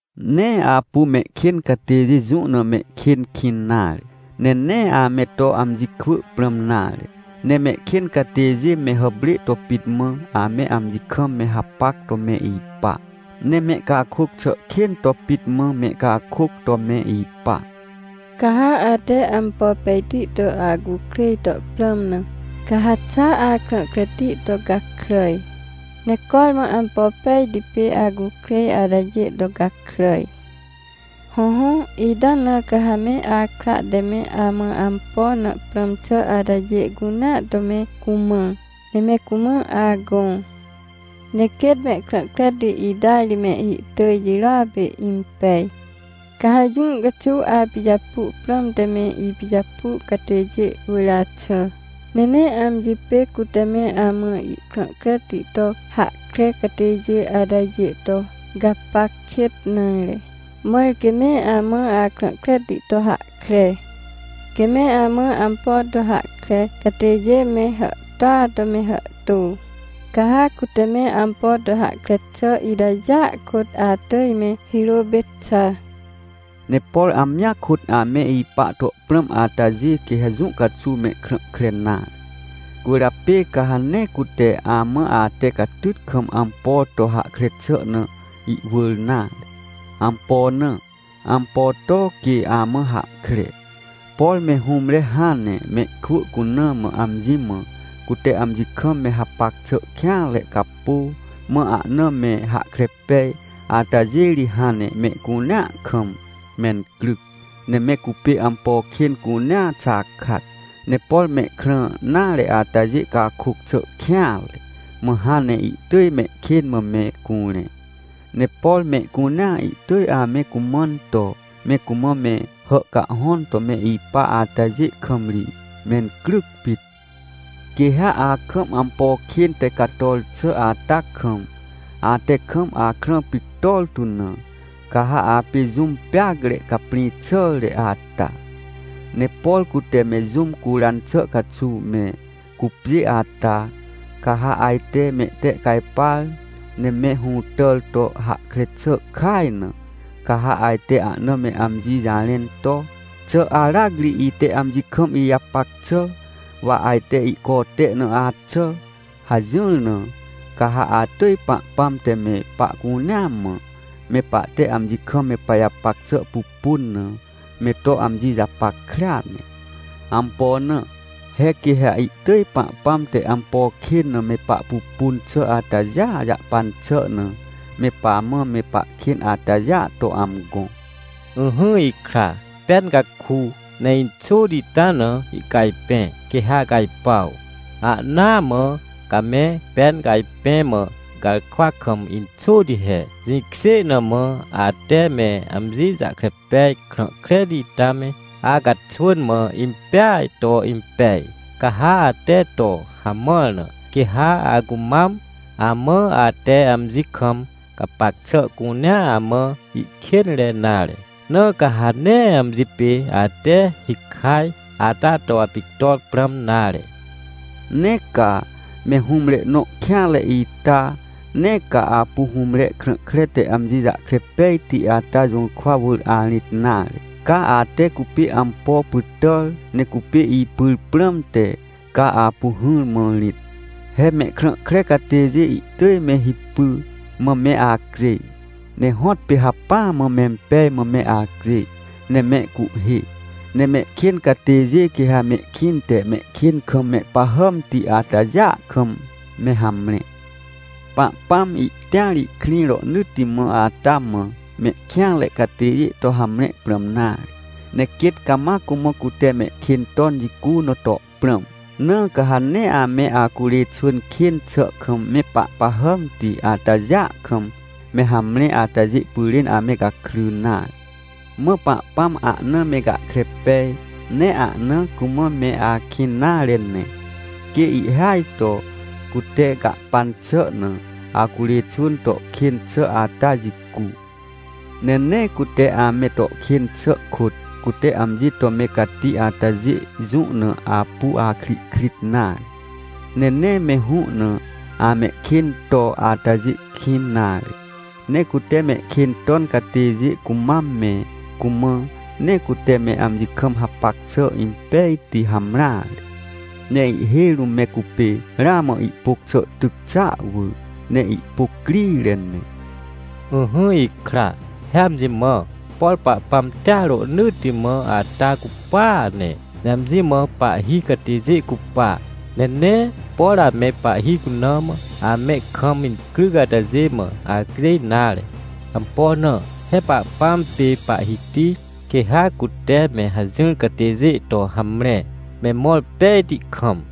Nee apu mehkên catêjê jũ na mehkên kĩn nare, ne nee ame to amji kwỳ prãm nare. Ne mehkên catêjê me hàprê to pit mã ame amji kam me hapac to me ipa, ne mehcakôc xà kên to pit mã mehcakôc to me ipa. Ca ha ate ampo pejti to acukrêj to prãm na, ca ha xa akrã kreti to gakràj, ne cormã ampo pejti pê acukrêj atajê to gakràj. Hõhõ, ita na ca ha me akra te me amã ampo na prãm xà atajê cunea to me cumã, ne me cumã agõ. Ne quêt mehkrã kreti ita ri mehhi tỳj jirôa pê impej. Ca ha jũ caxuw apijapu prãmte me ipijapu catêjê wỳr axà, ne nee amji pê cute me amã ihkrã kreti to hahkre catêjê atajê to gapac kêt nare, mãr quê me amã akrã kreti to hahkre. Quê me amã ampo to hahkre catêjê me hàhtôa to me hàhtô, ca ha cute me ampo to hahkre xà itajêa kôt atỳj me hirô pê xa. Ne por amjia kôt ame ipa to prãm atajê, quê ha jũ caxuw mehkrã kre nare, cwỳrjapê ca ha nee cute amã ate catyt kam ampo to hahkre xà na ihwỳr nare. Ampo na? Ampo to quê amã hahkre? Por me hũmre hãn ne mehkwỳ cuna mã amji mã, cute amji kam me hapac xà kêanre capô, mã ahna me hahkre pej, atajê ri hãn ne mehcunea kam mencryc, ne me cupê ampo kên cunea xakat. Ne por mehkrã nare atajê cakôc xà kêanre, mã hãn ne ihtỳj mehkên mã me curẽ. Ne por mehcunea ihtỳj ame cumãn to, me cumã me hàhcahhõn to me ipa atajê kam ri, mencryc pit. Quê ha akam ampo kên te cator xà ata kam, ate kam akrã pictor tu na, ca ha apê jũm peacre caprĩ xàre ata. Ne por cute me jũm curan xà caxuw me cupjê ata, ca ha ajte mehtehcajpar ne me hũtàr to hahkre xà kaj na, ca ha ajte ahna me amji jarẽn to: — Xà aracri ite amji kam ijapac xà, wa ajte ihcote na axà? — hajỹr na, ca ha atỳj Pahpãm te me pahcunea mã, me pahte amji kam me pajapac xà pupun na, me to amji japackrea ne. Ampo na? He quê ha ihtỳj Pahpãm te ampo kên na me pahpupun xà atajêa jahpan xà na, me pamã me pahkên atajêa to amgõ. Ỹhỹ ikra, pen ca ku, ne inxôti ita na ihcajpẽ, quê ha acajpuaw. Ahnaa mã ca me pen cajpẽ mã garkwa kam inxôti he. Jĩkjê na mã, ate me amji jahkre pej krã kreti ita me acaxwỳn mã impeaj to impej. Ca ha ate to hamãr na, quê ha acumam amã ate amji kam gapac xà cunea amã ihkênre nare. Na ca ha nee amji pê ate hikaj ata to apictor prãm nare. Ne ca, me hũmre nõ kêanre ita! Nee ca apu hũmre krã kre te amji jahkre pejti ata jũrkwa wỳr arĩt nare, ca ate cupê ampo pytàr, ne cupê ipyr prãmte, ca apu hỹrmã rĩt. He mehkrã kre catêjê ihtỳj me hipy mã me acjêj, ne hõtpê hacpỹa mã mempej mã me acjêj, ne mehcuhhê. Ne mehkên catêjê, quê ha mehkĩnte mehkên kam mehpahàmti atajêa kam me hamre. Pahpãm ihtĩar ihkrĩ rohnỳtti mã ata mã mehkêanre catêjê to hamre prãm nare, ne quêt cama cumã cute mehkên ton jicu na to prãm. Na ca ha nee ame acurê xwỳn kên xà kam mehpahpahàmti atajêa kam me hamre atajê pyrên ame gakry nare. Mã Pahpãm ahna me gahkre pej, ne ahna cumã me akĩn nare ne, quê ihhêaj to cute gahpan xà na acurê xwỳn to kên xà ata jicu. Ne nee cute ame to kên xà kôt, cute amji to me cati atajê jũ na apu akrihkrit nare. Ne nee me hũ na amehkên to atajê kĩn nare. Ne cute mehkên ton catêjê cumam me cumã, nee cute me amji kam hapac xà impejti hamreare. Ne ihhêj rũm me cupê ramã ihpôc xà tyc xàa wỳr, ne ihpôc crire ne. Ỹhỹ ikra, he amji mã, por Pahpãm tĩar rohnỳtti mã ata cupaa ne, ne amji mã pahhi catêjê cupa. Ne nee, por ame pahhi cuna mã, ame kam incryc atajê mã acjêj nare. Ampo na? He Pahpãm pê Pahhiti, quê ha cute me hajỹr catêjê to hamre, me mõr pejti kam.